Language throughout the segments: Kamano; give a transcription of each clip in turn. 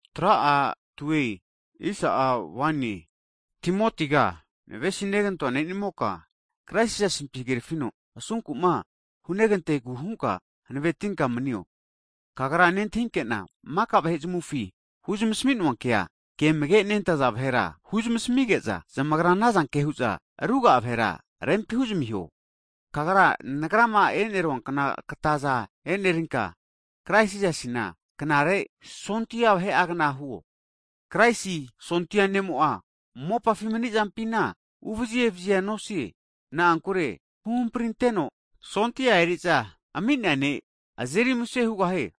Hagi Timotiga navesinegantoa ne'nimoka, Krais Jisasima asunku'ma hunegantegu hunka hanavetinka asunkuzampi manio. Kagra nentahinke'na maka vahe zamufi huzmasamino'a kema amage nentaza vahera huzamasmige'za, zamagra ana zanke hu'za ruga'a vahera rempi huzamiho. Kagra nagrama enerua kna kataza enerinka, Krais Jisasina knare sondia vahe'agna huo. Kraisi sondia ne'mo'a mopafi mani'zampina uvazi evazia nosie. Na'ankure huhampri anteno sondia eri'za ami'nea ne' azeri muse hugahie.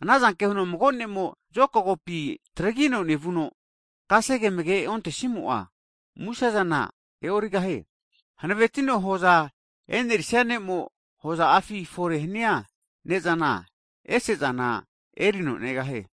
Ana zanke huno mago ne'mo'ma zokagopi taragino nevuno, kasege amage' ontesimo'a muse'zana kini fetorira e'origahie. Hanavetino hoza enerisia ne'mo'a hoza'afi fore hania ne'zana ese'zana agra'a erino negahie.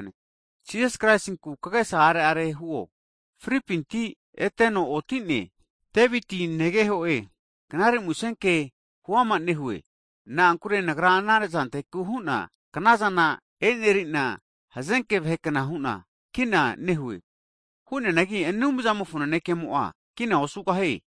Hagi Jisas Kraisinku kagesa are'are huo, fripinti eteno oti'ne, Daviti negeho'e, Knare Musenke (gospol) huama nehue. Na'ankure nagra ana zanteku hu'na knazana eneri'na hazenke vahe kna hu'na kina nehue. Hu'neanagi Anumzamofo nanekemo'a kina osu'ne.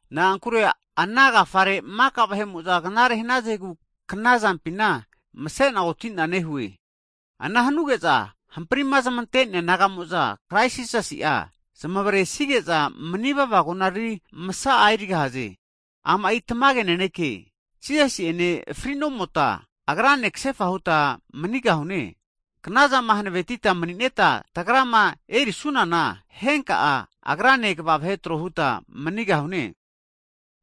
Na'ankure ana agafare maka vahe'mo'za knare hanazegu kna zampina mase'na oti'na nehue. Ana hanuge'za hamprima zamante'nea naga'mo'za Krais Jisasi'a zamaresige'za manivava konariri masa'a (glori) erigahaze. Ama'i tamage naneke, Jisasi'ene fri'nomota, agrane kasefa huta manigahune. Knazama hanavetita mani'neta tagrama erisunana, henka'a Agrane kini kva vahe tro huta manigahune.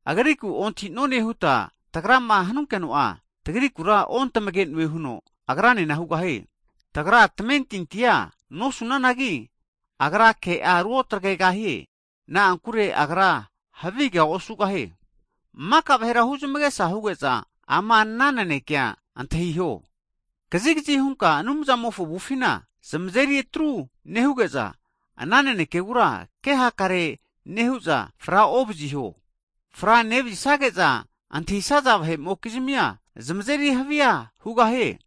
Agriku'ma ontahi'none huta tagrama hu frakisunkeno'a, tagrikura ontamage'noe huno Agranena hu frakigahie. Tagra tamentintima osanunana, Agra ke'a ruotagregahie. Na'ankure Agra havigea osugahie. Maka vahera huzmagesa huge'za ama ana nanekea antahiho. Kazigazi hunka Anumzamofo avufina zamazeri atru nehuge'za, ana nanekegura ke hakare osu'za fra ovaziho. Fra nevazisage'za antahisaza vahe'mokizmia zamazeri havia hugahie.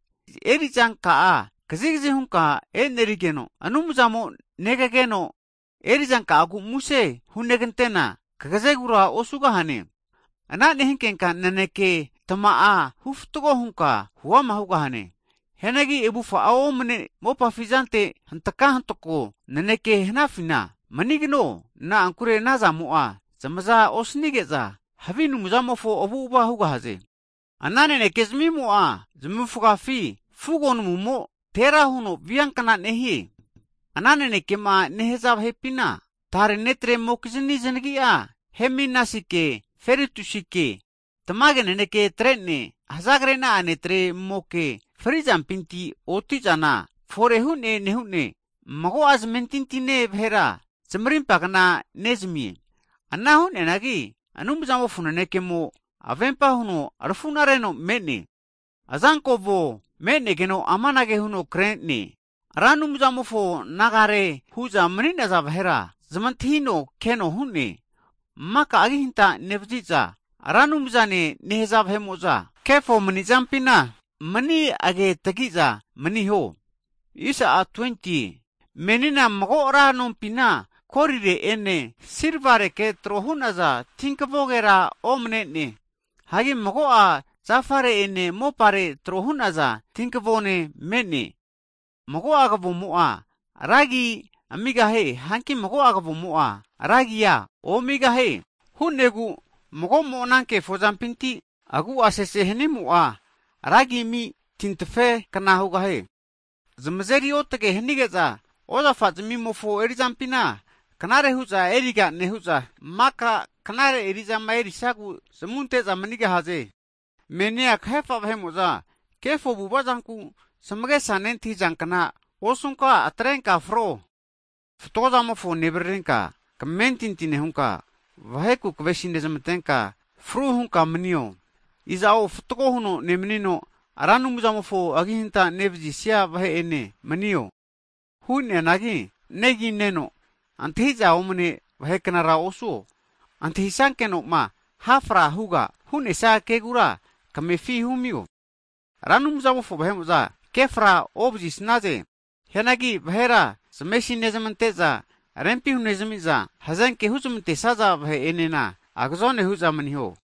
Eri'zanka'a kazigazi hunka e'nerigeno, Anumzamo negageno erizanka'agu muse hunegantena, kagazegura osugahane. Ana nehinkenka tamage naneke'a hufatgo hunka huama hugahane. Hianagi avufa'a omne mopafi zante hantaka hantoko naneke hanafina manigno, na'ankure ana zamo'a zamaza osanige'za Anumzamofo avu'avara osugahaze. Ana naneke zamimo'a zamufgafi (gengrin, kensa), fugo namumo tera huno via kna nehie. Ana nanekema nehaza vahe'pina, tare netremokizni zanagi'a Himenasi'ene Filetusike, tamage naneke atre'ne hzagrena'a netremoke fri'zanpinti oti'zana hago fore hu'ne nehune, mago'a zamentintine vahera zamarimpa kna erinezmi'e. Ana hu'neanagi Anumzamofo nanekemo avempa huno arafuna reno me'ne, azanko avo (seal) me'negeno amanage huno kre'ne, Ra Anumzamofo nagare hu'za mani'naza vahera zamantahino keno hu'ne. Agi hanta nevaziza Ra Anumzane nehaza maka vahe'mo'za kefo mani'zampina mani agetagi'za maniho. Hagi menia mago ra nompina golire'ene silvareke tro hu'naza tinkavogera omne'ne. Hagi mago'a zafare'ene mopare'ene trohu'naza tinkavone me'ne, mago'a kavomo'a ranra eri'za erigahie. Hanki mago'a kavomo'za, vahe'mo'a antahi omi eri'za erigahaze. Hu'negu mago'mo ana kefo zampinti agu'a sese hanimo'a, ranra eri'za eri tintafe kna hugahie. Zamazeri otage hanige'za, ozafa zamimofo eri'zampina knare hu'za eriga nehu'za, maka knare eri'zama erisagu zamu ante'za manigahaze. Menia kahefa vahe'mo'za kefo avu'avazanku zamagesa nentahizankna osunka atrenka fro, fatgo zamofo nevaririnka, kamentinti nehunka, vaheku kavesi nezmantenka fru hunka manio. Iza'o fatgo huno nemanino, Ra Anumzamofo agihanta nevzisia vahe'ene manio. Hu'neanagi negi neno antahi'za omne vahe knara osuo, antahi sankeno'ma hafra huga hu'nesia kegura kamefi humio. Ra Anumzamofo vahe'mo'za kefra ovazi snaze, hianagi vahera zamesi nezmante'za, rempi hunezmi'za, hazenke huzmante'saza vahe enena agazone hu'za maniho,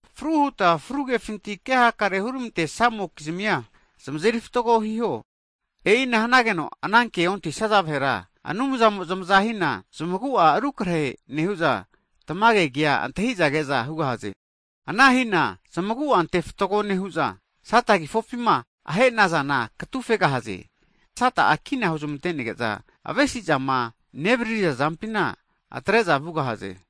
Fru huta fru kefinti ke hakare hurmantesamokizmia zamazeri fatgo hiho. E'ina hanageno ana ke ontahisaza vahera Anumzamo'a zamaza hina, zamagu'a rukrahe nehu'za tamage kea antahi'za ke'za hugahaze. Ana hina zamagu'a ante fatgo nehu'za, Sata kifopima ahe'nazana katufegahaze. Sata'a kina huzmante'nege'za avesi'zama nevaririza zampintira atre'za vugahaze.